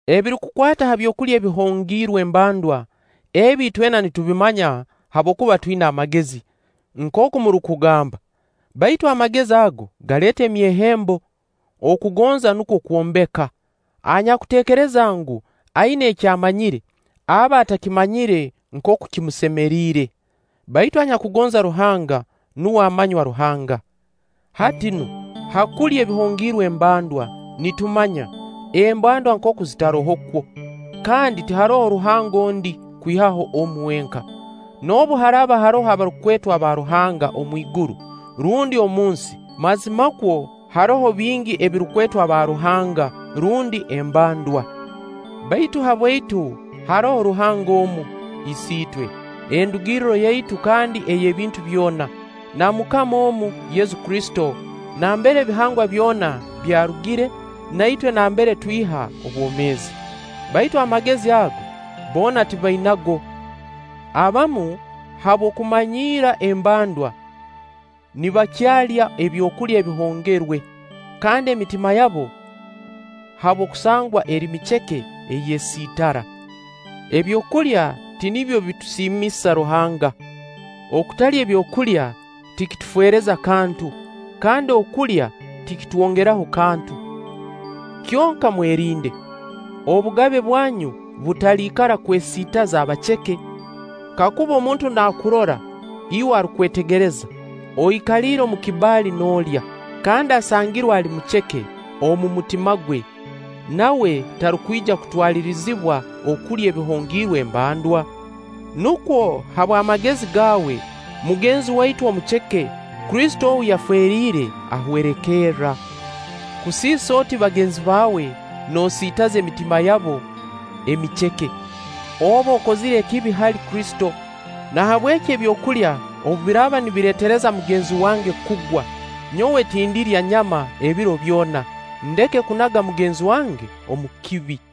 Ebirukukwata ha byokulya ebihongiirwe embandwa, ebi itwena nitubimanya habwokuba “Twina amagezi”, nkooku murukugamba. Baitu “Amagezi” ago galeeta emyehembo; okugonza nukwo kwombeka. Anyakuteekereza ngu, aina eki amanyire, aba atakamanyire nkooku kimusemeriire. Baitu anyakugonza Ruhanga, nuwe amanywa Ruhanga. Hati nu, ha kulya ebihongiirwe embandwa, nitumanya “embandwa nkooku zitarohokwo”, kandi “Tiharoho Ruhanga ondi, kwihaho omu wenka.” Noobu haraaba haroho abarukwetwa baruhanga omwiguru rundi omu nsi mazimakwo haroho bingi ebirukwetwa “baaruhanga” rundi “embandwa”, baitu habwaitu haroho Ruhanga omu, Isiitwe, endugirro yaitu kandi ey'ebintu byona, na MUKAMA omu Yesu Kristo nambere ebihangwa byona byarugire, na itwe nambere twiha obwomeezi. Baitu amagezi ago, boona tibainago. Abamu, habw'okumanyiira embandwa, nibakyalya ebyokulya ebihongerwe; kandi emitima yabo habw'okusangwa eri miceke eyesiitara. Ebyokulya tinibyo bitusiimisa Ruhanga. Okutalya ebyokulya tikitufeereza kantu, kandi okulya tikitwongeraho kantu. Kyonka mwerinde, obugabe bwanyu butaliikara kwesiitaza abaceke. Kakuba omuntu naakurora, iwe arukwetegereza, oikaliire omu kibbali noolya, kandi asangirwe ali muceke omu mutima gwe, nawe tarukwija kutwalirizibwa okulya ebihongiirwe embandwa? Nukwo habw'amagezi gaawe, mugenzi waitu omuceke Kristo ou yafeeriire, ahwerekerra. Kusiisa oti bagenzi bawe noosiitaza emitima yabo emiceke, oba okozire ekibi hali Kristo. Nahabweki ebyokulya obu biraaba nibireetereza mugenzi wange kugwa, nyowe tindirya nyama ebiro byona, ndeke kunaga mugenzi wange omu kibi.